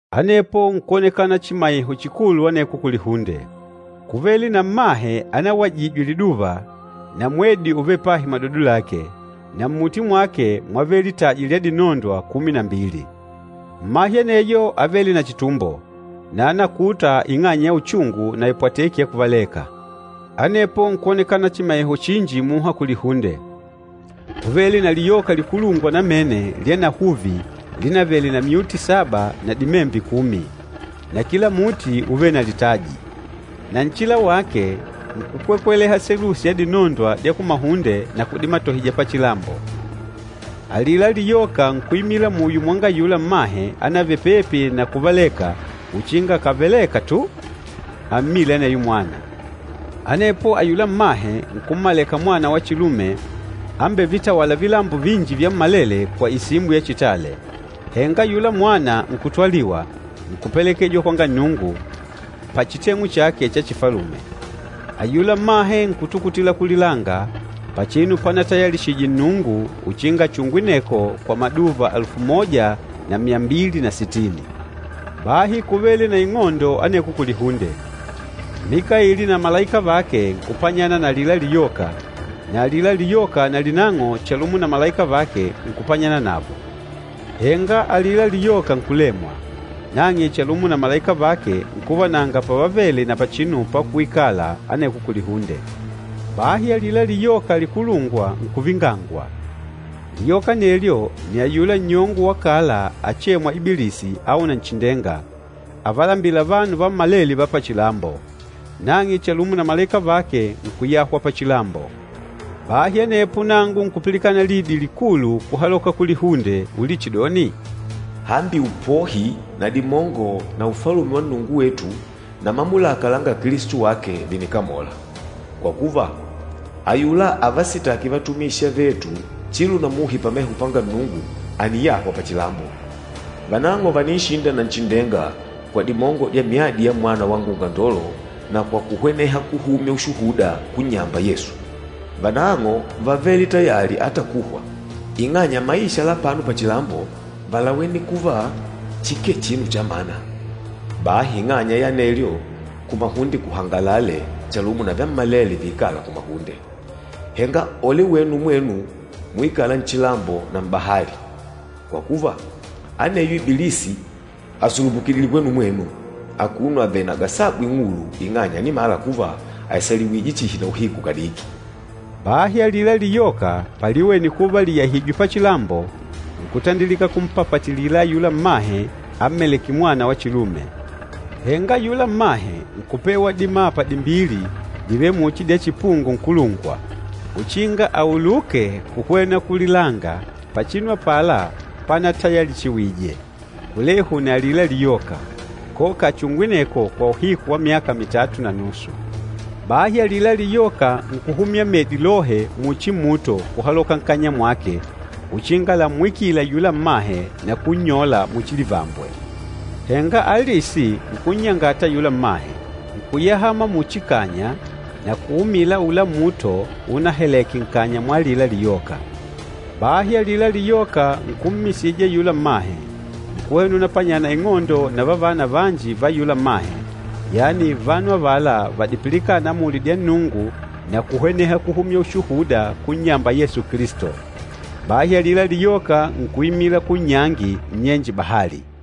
Anepo nkwonekana chimaiho chikulu aneko kulihunde. Kúvele na mmahe anawajijwe liduva, na mwedi úvele pahi madodo lake, na mmuti mwake mwávele litaji lya dinondwa kumi na mbili. Mmahe aneyo ávele na chitumbo, na ánakuta ing'anya ya uchungu na ipwateki ya kuvaleka. Anepo nkwonekana chimaiho chinji muha kulihunde. Kúvele na liyoka likulungwa namene lyanahuvi linavele na myuti saba na dimembe kumi. Na kila muti úvele na litaji. Na nchila wake nkukwekweleha selusi ya dinondwa dya kumahunde na kudimatohija pachilambo. Alila liyoka nkuimila muyo mwanga ayula mmahe anavele pepi na kuvaleka uchinga akàvaleka tu ammile aneyo mwana. Anepo ayula mmahe nkummaleka mwana wa chilume ambevitawâla vilambo vinji vyammalele kwa isimbo ya chitale. Henga ayula mwana nkutwaliwa, nkupelekejwa kwanga Nnungu, pachiteng'u chake cha chifalume. Ayula mmahe nkutukutila kulilanga pachinu panapatayalishije Nnungu uchinga achungwe aneko kwa maduva alufu moja na myambili na sitini. Bahi kúvele na ing'ondo aneko kulihunde. Mikaili na malaika vake nkupanyana na alila liyoka, na alila liyoka nalinang'o chalumo na malaika vake, nkupanyana navo. Henga alila liyoka nkulemwa, nang'e chalumo na malaika vake nkuva nanga pavavele na pachinu pakuikala aneko kulihunde. Bahi alila liyoka likulu nkuvingangwa. Liyoka anelyo nni ayula nnyongo wa kala achêmwa, Ibilisi au Nanchindenga, avalambîla vanu vammalele va pachilambo. Nang'e chalumo na malaika vake nkuyahwa pachilambo. Bahi anepo nangu nkupilikana lidi likulu kuhaloka kulihunde, ulichidoni, “Hambi upohi na dimongo na Ufalume wa Nnungu wetu na mamulaka langa Kilisto wake, vìnikamola. Kwa kuva, ayula avasitâki vatumishi avetu chilo na muhi pameho panga Nnungu àniyahwa pachilambo. Vanang'o vàninshinda Nanchindenga kwa dimongo dya myadi ya Mwana wanga Ungandolo na kwa kuhweneha kuhumya ushuhuda kunnyamba Yesu. Vanang'o vávele tayali ata kuhwa, ing'anya maisha la apano pachilambo válawene kuva chikee chinu chamana. Bahi ing'anya ya anelyo, kumahunde kuhangalale chalumo na vyammalele viikâla kumahunde! Henga ole wenu mwenu muikâla nchilambo na m'bahali! Kwa kuva, aneyo Ibilisi àsulupukidile kwenu mwenu, akuno avèlè na gasabu ing'ulu, ing'anya ànimala kuva àisaliwije chihi na uhiku kadiki.” Bahi alila liyoka paliwene kuva lìyahijwe pachilambo, nkutandilika kumpapatilila ayula mmahe ammalêke mwana wa chilume. Henga ayula mmahe nkupewa dimapa dimbili divêle muchi dya chipungo nkulungwa, uchinga auluke kuhwena kulilanga pachinu apala panatayalishiwije, kulehu na alila liyoka, koka achungwe aneko kwa uhiku wa myaka mitatu na nusu. Bahi alila liyoka nkuhumya medi lohe muchi muto kuhaloka nkanya mwake uchinga lammwikile ayula mmahe na kunnyola muchi livambwe. Henga alisi nkunnyangata ayula mmahe, nkuyahama muchi kanya na kuumila aula muto unahaleke nkanya mwa alila liyoka. Bahi alila liyoka nkummisija ayula mmahe, nkuhwena unapanyana ing'ondo na vavana vanji va ayula mmahe, yani vanu avala vadipilikâna amuli dya Nnungu na kuhweneha kuhumya ushuhuda kunnyamba Yesu Kilisto. Bahi alila liyoka nkuimila kunnyangi, nnyenje bahali.